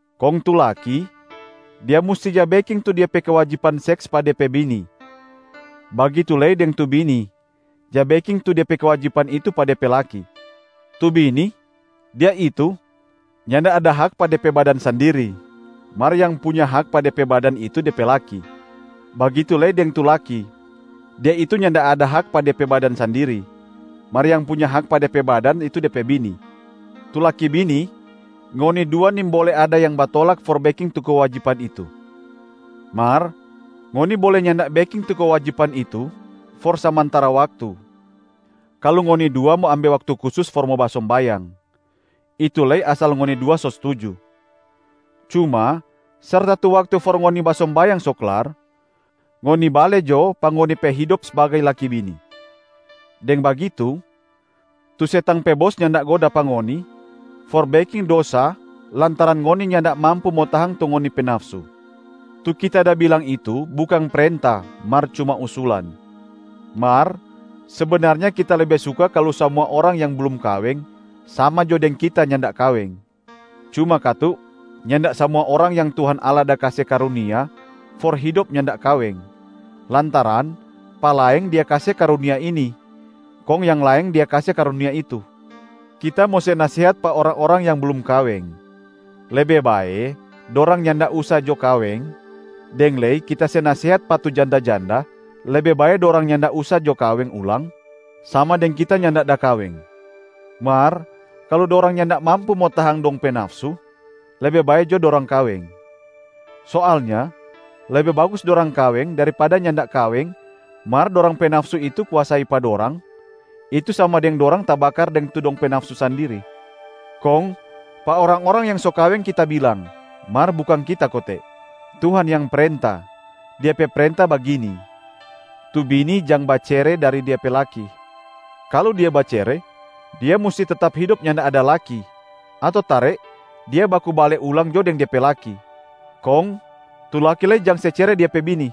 Kong tu laki, dia musti ja beking tu dia pe kewajiban seks pa de pe bini, bagitu lei deng tu bini ja beking tu de pe kewajiban itu pa de pe laki. Tu bini, dia itu nyanda ada hak pa de pe badan sandiri, mar yang punya hak pa de pe badan itu de pe laki. Bagitu lei deng tu laki, dia itu nyanda ada hak pa de pe badan sandiri, mar yang punya hak pa de pe badan itu de pe bini. Tu laki-bini, ngoni dua nimbole ada yang batolak for beking tu kewajiban itu. Mar ngoni bole nyanda beking tu kewajiban itu for samantara waktu, kalu ngoni dua mo ambe waktu kusus for mo basombayang, itu lei asal ngoni dua so stuju. Cuma serta tu waktu for ngoni basombayang so klar, ngoni bale jo pa ngoni pe hidop sbagai laki-bini. Deng bagitu, tu setang pe bos nyanda goda pa ngoni for beking dosa lantaran ngoni nyanda mampu mo tahang tu ngoni pe nafsu. Tu kita da bilang itu bukang prenta mar cuma usulan. Mar sebenarnya kita lebe suka kalu samua orang yang blum kaweng sama jo deng kita nyanda da kaweng. Cuma katu, nyanda samua orang yang Tuhan Allah da kase karunia for hidop nyanda kaweng, lantaran pa laeng Dia kase karunia ini, kong yang laeng Dia kase karunia itu. Kita mo se nasehat pa orang-orang yang blum kaweng, lebe bae dorang nyanda usa jo kaweng, deng lei kita se nasehat pa tu janda-janda, lebe bae dorang nyanda usa jo kaweng ulang, sama deng kita nyanda da kaweng. Mar kalu dorang nyanda mampu mo tahang dong pe nafsu, lebe bae jo dorang kaweng. Soalnya lebe bagus dorang kaweng daripada nyanda kaweng mar dorang pe nafsu itu kuasai pa dorang, itu sama deng dorang tabakar deng tu dong pe nafsu sandiri. Kong pa orang-orang yang so kaweng kita bilang, mar bukang kita kote, Tuhan yang prenta, Dia pe prenta bagini: tu bini jang bacere dari dia pe laki. Kalu dia bacere, dia musti tetap hidop nyanda ada laki ato tare dia baku bale ulang jo deng de pe laki. Kong tu laki lei jang se cere dia pe bini.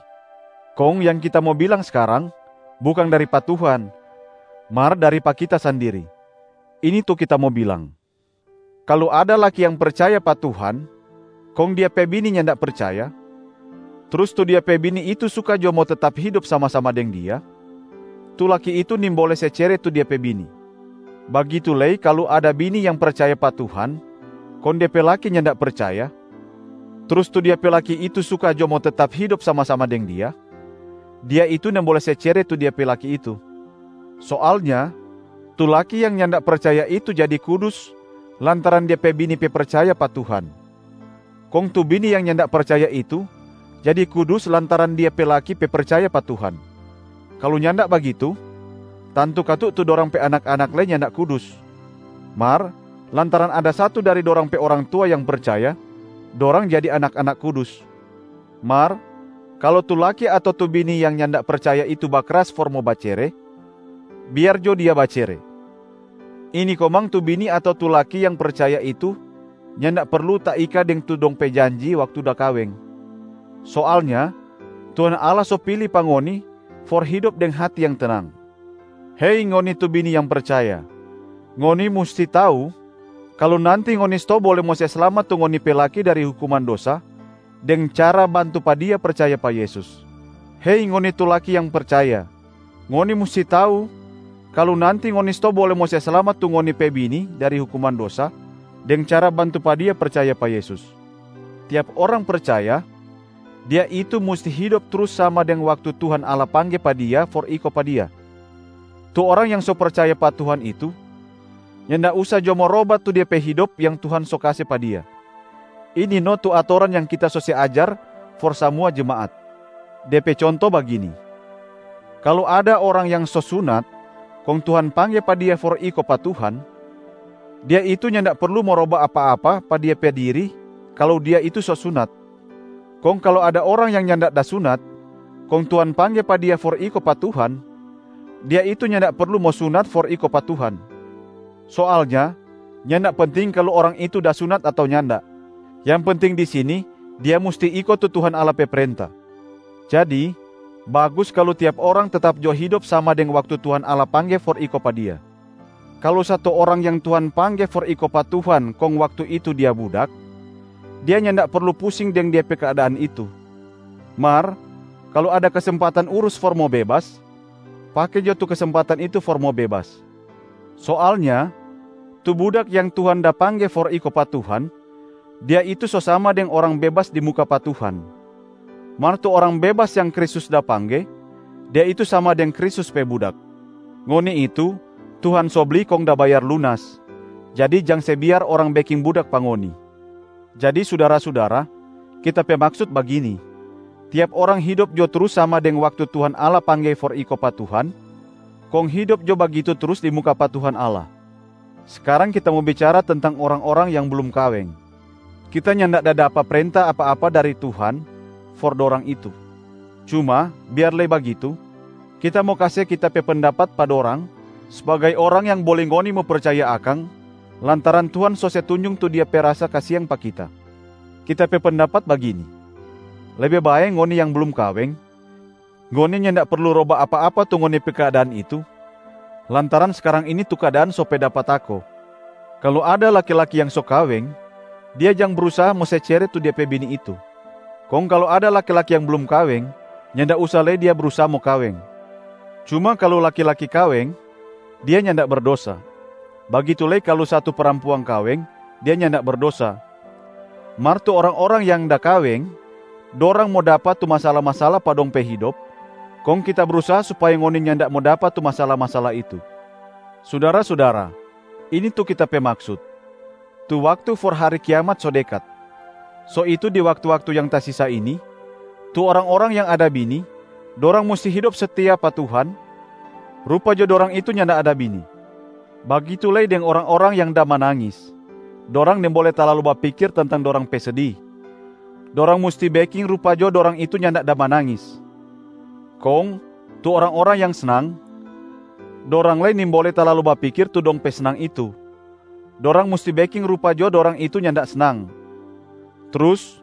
Kong yang kita mo bilang skarang, bukang dari pa Tuhan mar dari pa kita sandiri. Ini tu kita mo bilang: kalu ada laki yang percaya pa Tuhan kong dia pe bini nyanda percaya, trus tu dia pe bini itu suka jo mo tetap hidop sama-sama deng dia, tu laki itu nimbole se cere tu dia pe bini. Bagitu lei kalu ada bini yang percaya pa Tuhan kong de pe laki nyanda percaya, trus tu dia pe laki itu suka jo mo tetap hidop sama-sama deng dia, dia itu nimbole se cere tu dia pe laki itu. Soalnya tu laki yang nyanda percaya itu jadi kudus lantaran dia pe bini pe percaya pa Tuhan, kong tu bini yang nyanda percaya itu jadi kudus lantaran dia pe laki pe percaya pa Tuhan. Kalu nyanda bagitu, tantu katu tu dorang pe anak-anak lei nyanda kudus, mar lantaran ada satu dari dorang pe orang tua yang percaya, dorang jadi anak-anak kudus. Mar kalu tu laki ato tu bini yang nyanda percaya itu bakras for mo bacere, biar jo dia bacere. Ini komang tu bini ato tu laki yang percaya itu nyanda perlu taika deng tu dong pe janji waktu da kaweng. Soalnya Tuhan Allah so pili pa ngoni for hidop deng hati yang tenang. Hei ngoni tu bini yang percaya, ngoni musti tau kalu nanti ngoni stou bole mo se slamat tu ngoni pe laki dari hukuman dosa deng cara bantu pa dia percaya pa Yesus. Hei ngoni tu laki yang percaya, ngoni musti tau kalu nanti ngoni stou bole mo se slamat tu ngoni pe bini dari hukuman dosa deng cara bantu pa dia percaya pa Yesus. Tiap orang percaya, dia itu musti hidop trus sama deng waktu Tuhan Allah pangge pa dia for iko pa Dia. Tu orang yang so percaya pa Tuhan itu nyanda usa jo mo roba tu de pe hidop yang Tuhan so kase pa dia. Ini no tu atoran yang kita so se ajar for samua jemaat. De pe conto bagini: kalu ada orang yang so sunat, kong Tuhan pangge pa dia for iko pa Tuhan, dia itu nyanda perlu mo roba apa-apa pa de pe diri kalu dia itu so sunat. Kong kalu ada orang yang nyanda da sunat, kong Tuhan pangge pa dia for iko pa Tuhan, dia itu nyanda perlu mo sunat for iko pa Tuhan. Soalnya nyanda penting kalu orang itu da sunat ato nyanda. Yang penting di sini dia musti iko tu Tuhan Allah pe prenta. Jadi bagus kalu tiap orang tetap jo hidop sama deng waktu Tuhan Allah pangge for iko pa Dia. Kalu satu orang yang Tuhan pangge for iko pa Tuhan, kong waktu itu dia budak, dia nyanda perlu pusing deng de pe keadaan itu. Mar kalu ada kesempatan urus for mo bebas, pake jo tu kesempatan itu for mo bebas. Soalnya tu budak yang Tuhan da pangge for iko pa Tuhan, dia itu so sama deng orang bebas di muka pa Tuhan. Mar tu orang bebas yang Kristus da pangge, dia itu sama deng Kristus pe budak. Ngoni itu Tuhan so bli kong da bayar lunas, jadi jang se biar orang beking budak pa ngoni. Jadi sudara-sudara, kita pe maksut bagini: tiap orang hidop jo trus sama deng waktu Tuhan Allah pangge for iko pa Tuhan, kong hidop jo bagitu trus di muka pa Tuhan Allah. Skarang kita mo bicara tentang orang-orang yang blum kaweng. Kita nyanda da dapa prenta apa-apa dari Tuhan for dorang itu. Cuma biar lei bagitu, kita mo kase kita pe pendapat pa dorang sbagai orang yang bole ngoni mo percaya akang, lantaran Tuhan so se tunjung tu Dia pe rasa kasiang pa kita. Kita pe pendapat bagini: lebe bae ngoni yang blum kaweng, ngoni nyanda perlu roba apa-apa tu ngoni pe keadaan itu lantaran skarang ini tu keadaan so pe dapa tako. Kalu ada laki-laki yang so kaweng, dia jang brusaha mo se cere tu dia pe bini itu. Kong kalu ada laki-laki yang blum kaweng, nyanda usa lei dia brusaha mo kaweng. Cuma kalu laki-laki kaweng, dia nyanda berdosa. Bagitu lei kalu satu parampuang kaweng, dia nyanda berdosa. Mar tu orang-orang yang da kaweng, dorang mo dapa tu masala-masala pa dong pe hidop, kong kita brusaha supaya ngoni nyanda mo dapa tu masala-masala itu. Sudara-sudara, ini tu kita pe maksut: tu waktu for hari kiamat so dekat. So itu di waktu-waktu yang tasisa ini, tu orang-orang yang ada bini, dorang musti hidop setia pa Tuhan, rupa jo dorang itu nyanda ada bini. Bagitu lei deng orang-orang yang da manangis, dorang nimbole talalu bapikir tentang dorang pe sedi, dorang musti beking rupa jo dorang itu nyanda da manangis. Kong tu orang-orang yang snang, dorang lei nimbole talalu bapikir tu dong pe snang itu, dorang musti beking rupa jo dorang itu nyanda snang. Trus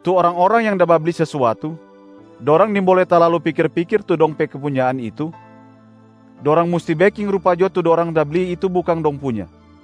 tu orang-orang yang da babli sesuatu, dorang nimbole talalu pikir-pikir tu dong pe kepunyaan itu, dorang musti beking rupa jo tu dorang da bli itu bukang dong punya.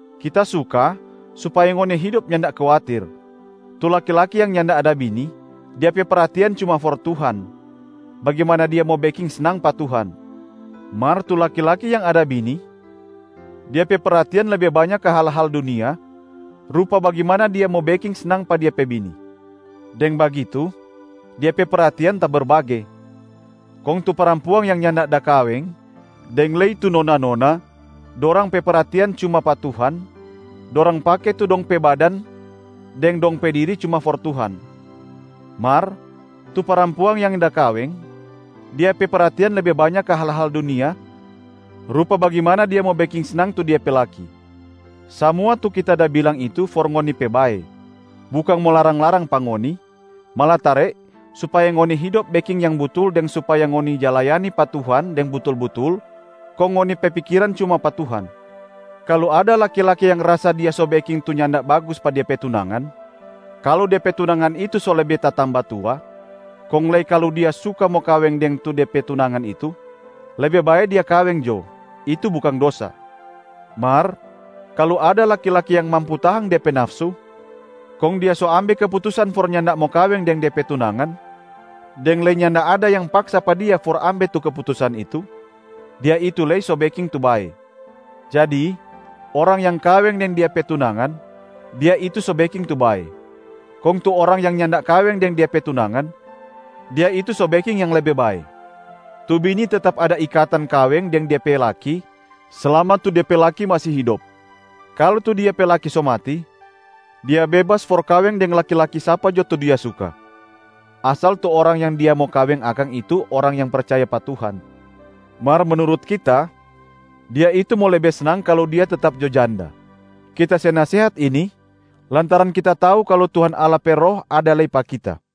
Kita suka supaya ngoni hidop nyanda kuatir. Tu laki-laki yang nyanda ada bini, dia pe perhatian cuma for Tuhan, bagimana dia mo beking snang pa Tuhan. Mar tu laki-laki yang ada bini, dia pe perhatian lebe banya ka hal-hal dunia, rupa bagimana dia mo beking snang pa dia pe bini. Deng bagitu, dia pe perhatian taberbage. Kong tu parampuang yang nyanda da kaweng deng lei tu nona-nona, dorang pe perhatian cuma pa Tuhan, dorang pake tu dong pe badan deng dong pe diri cuma for Tuhan. Mar tu parampuang yang da kaweng, dia pe perhatian lebe banya ka hal-hal dunia rupa bagimana dia mo beking snang tu dia pe laki. Samua tu kita da bilang itu for ngoni pe bae, bukang mo larang-larang pa ngoni, malatare supaya ngoni hidop beking yang butul deng supaya ngoni ja layani pa Tuhan deng butul-butul kong ngoni pe pikiran cuma pa Tuhan. Kalu ada laki-laki yang rasa dia so beking tu nyanda bagus pa de pe tunangan, kalu de pe tunangan itu so lebe tatamba tua, kong lei kalu dia suka mo kaweng deng tu de pe tunangan itu, lebe bae dia kaweng jo, itu bukang dosa. Mar kalu ada laki-laki yang mampu tahang de pe nafsu, kong dia so ambe keputusan for nyanda mo kaweng deng de pe tunangan, deng lei nyanda ada yang paksa pa dia for ambe tu keputusan itu, dia itu lei so beking tu bae. Jadi orang yang kaweng deng dia pe tunangan, dia itu so beking tu bae. Kong tu orang yang nyanda kaweng deng dia pe tunangan, dia itu so beking yang lebe bae. Tu bini tetap ada ikatan kaweng deng dia pe laki slama tu de pe laki masi hidop. Kalu tu dia pe laki so mati, dia bebas for kaweng deng laki-laki sapa jo tu dia suka, asal tu orang yang dia mo kaweng akang itu orang yang percaya pa Tuhan. Mar menurut kita, dia itu mo lebe snang kalu dia tetap jo janda. Kita se nasehat ini lantaran kita tau kalu Tuhan Allah pe Roh ada lei pa kita.